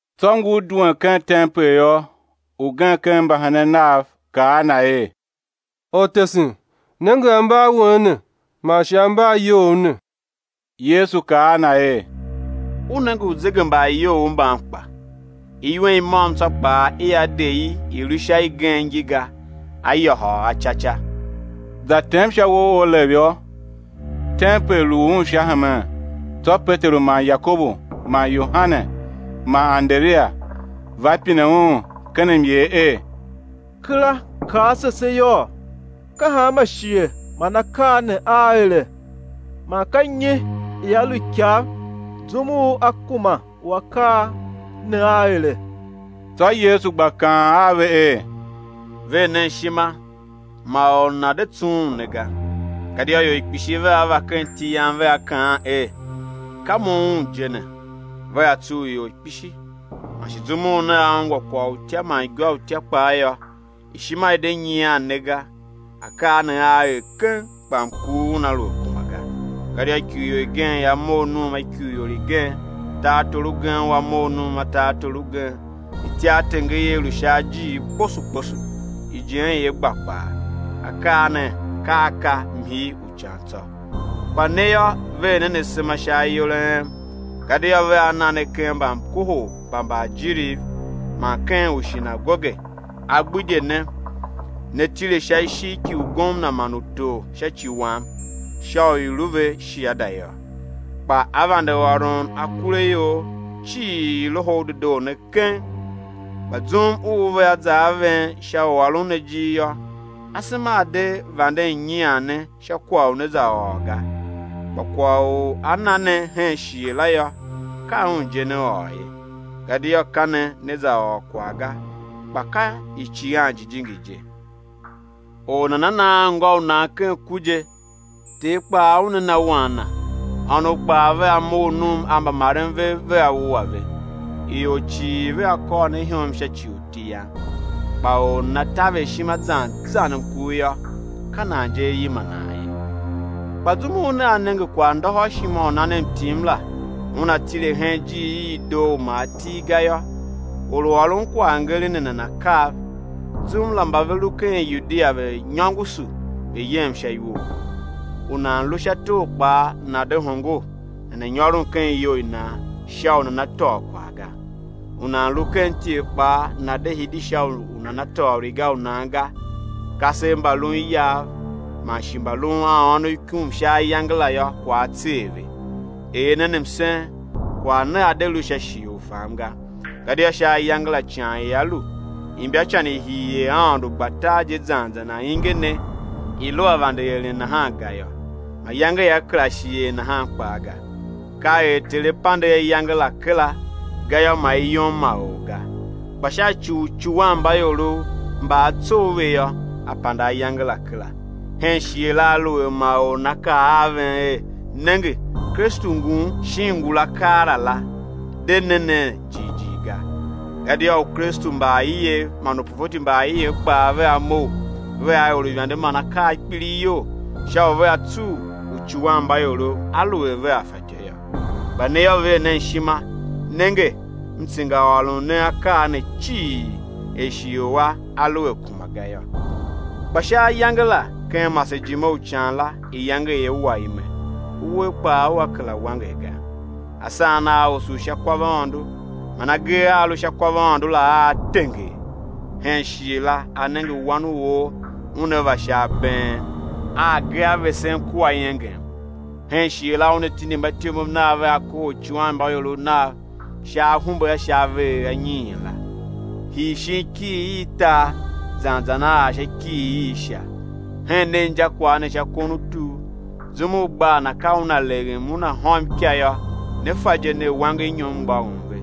Tsô ngur duen ken tempel yô, ugen ken mbahenen Nav kaa a Na er: Ortesen, nenge ambaawen ne man shi ambaayou ne! Yesu kaa a na er: U nenge uzegembaayoughouv mban kpa? Iwen i môm tsô kpaa i á de i i̱ lu sha igen ngi ga, á yôhôl a ca ca. Za tem sha uwo u Olev yô, tempel lu Un sha hemen, tsô Peteru man Yakobu man Yohane man Anderia va pine Un ken myer er: Kera kaa ase se yôô, ka hanma shighe man akaa ne aa ere? man ka nyi ia lu ikav, zum u á kuma u akaa ne aa ere? Tsô Yesu gba kaan a ve er: Ver nen ishima, ma or nana̱ de tsughun ne ga. Gadia ior kpishi vea va ken iti Yam, vea kaan er: Ka mo, Un je ne! Vea tsugh ior kpishi. Man shi zum u nea ungwa kwagh u utya man igwa i utya kpaa yô, ishima i̱ de nyian ne ga, akaa ne aa er keng, kpa mkur una lu a kuma ga. Gadia ikurior igen ia mough num a ikurior igen, tartor ugen ua mough num a tartor ugen; ityartenger ia lu sha ajiir kposo kposo, ijen ia gba kpaa, akaa ne ka a ka mhii u ican tsô. Kpa ne yô, ver nen asema sha ayol a en, gadia vea na ne ken mbamkohol mba mbaajiriv, man ken ushinagoge, á gbidye ne; né tile sha ishigh ki ugomna man utor sha ci Wam, sha u i̱ lu ve shiada yô. Kpa á vande ôron akuraior cii Loho u Dedoo ne keng. Kpa zum u vea za a ven sha u ôron ne ijir yô, asema a̱ de vanden nyian ne sha kwagh u né za ôr ga. Kpa kwagh u á na ne hen shighe la yô, ka un je né ôr ye; gadia ka ne né ôr kwagh ga, kpa ka Icighan Jijingi je. Or nana na anngô u nan ken ku je; ter kpaa una na wan na; ônov kpaa vea mough num a mbamaren vev, vea wua ve. Ior cii vea kôr ne ihom sha ci u iti Yam. Kpa or u nana taver ishima zan zan mkur yô, ka nan je á yima nan ye. Kpa zum u nea nenge kwaghndôhôrshima u nan mtim la una tile hen ijiir i i doo u ma a til ga yô,—or u ôron kwaghngeren ne nana̱ kav—zum la, mba ve lu ken Yudia, ve̱ nyôngoso ve̱ yem sha iwo. U nan lu sha tor kpaa, nana̱ de hongo nana̱ nyôron ken iyou i nan sha u nana̱ tôô kwagh ga. U nan lu ken ityev kpaa, nana̱ de hidi sha u nana tôô riga u nan ga. Kasev mba lun iyav man shi mbalun a ônov ikum sha ayange la yô, kwagh á tser ve. Er nen msen, kwagh ne a̱ de lu sha shighe u fam ga. Gadia sha ayange la, ican ia lu, imbacan i hii er Aôndo gba tar je zan zan ainge ne i lu a vande eren nahan ga yô, mayange ia kera shi er nahan kpaa ga. Ka er Ter A pande ayange la kera, gayô, ma i yom ma or ga; kpa sha ci u uicuwanmbaiorov mba A tsough ve yô, á pande ayange la kera. Hen shighe la, aluer ma or nana kaa a ven er: Nenge, Kristu ngun, shin ngula keela la, de ne nen jighjigh ga. Gadia Ukristu mba aiev man uprofeti mba aiev kpaa vea mough vea er uivande man akaa a kpilighyol, sha u vea tsugh uicuwanmbaiorov aluer vea fatyô yô. Kpa ne yô, ver nen ishima. Nenge, M tsengaôron ne akaa ne cii, er shighe u a, a lu a kuma ga yô. Kpa sha ayange la, ken masejime u ican la, iyange ia wa ime, uwer kpaa ua kera wanger ga. Asan aa osough sha kwavaôndo, man agee a a sha kwavaôndo la aa tenger. Hen shighe la, á nenge Wan u or Una va sha abeen, a agee a vesen kua iengem. Hen shighe la, Una tindi mbatyomov Nav vea kohol uicuwanmbaiorov Nav sha ahumbe a sha avegher anyiin la, hii shin ikighir i tar zan zan á ar sha ikighir i Sha. Hen nen injakwagh ne sha kon u tur. Zum u gbaa na ka una leghem una hôm ika yô, ne fa je ner, wangernyom mgbôghom ve.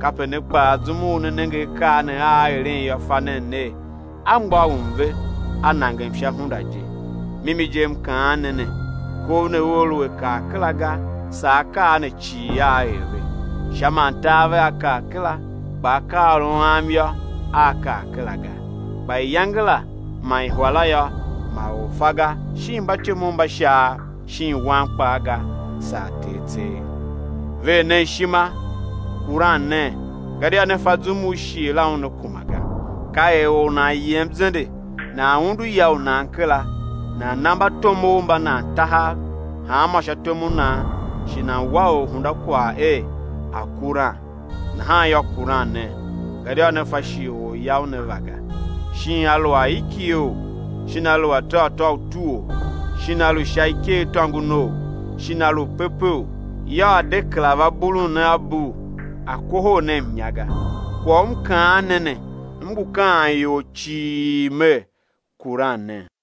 Kape ne kpaa, zum u né nenge akaa ne aa eren yô, fa nen ner, a mgbôghom ve, a nangem sha hunda je. Mimi je M kaan ne ne, kov ne ua lu a kar kera ga, saa akaa ne cii aa er ve. Sha man tar vea kar kera, kpa akaaôron a Am yô, aa kar kera ga. Kpa iyange la man ihwa la yô, ma or fa ga, shin mbatyomov mba Shaav shin Wan kpaa ga, saa Ter tseegh. Ver nen ishima, kuran nen, gadia ne fa zum u shighe la una kuma ga. Ka er or u nan yem zende, nan undu ya u nan kera, nan na mbatomov mba nan tahav, hanmô sha tom u nan, shi nan wa orhunda kwagh er a̱ kuran. Nahan yô, kuran nen, gadia ne fa shighe u Orya Una va ga, shin a lu aikigheou, shin a lu atôghatô u utuou, shin a lu sha ikeghtôngonou, shin a lu pepeou, yô, A̱ de kera va bulun ne a bul A̱ kohol ne mnya ga. Kwagh u M kaan ne ne, M ngu kaan ior cii Mer: Kuran nen.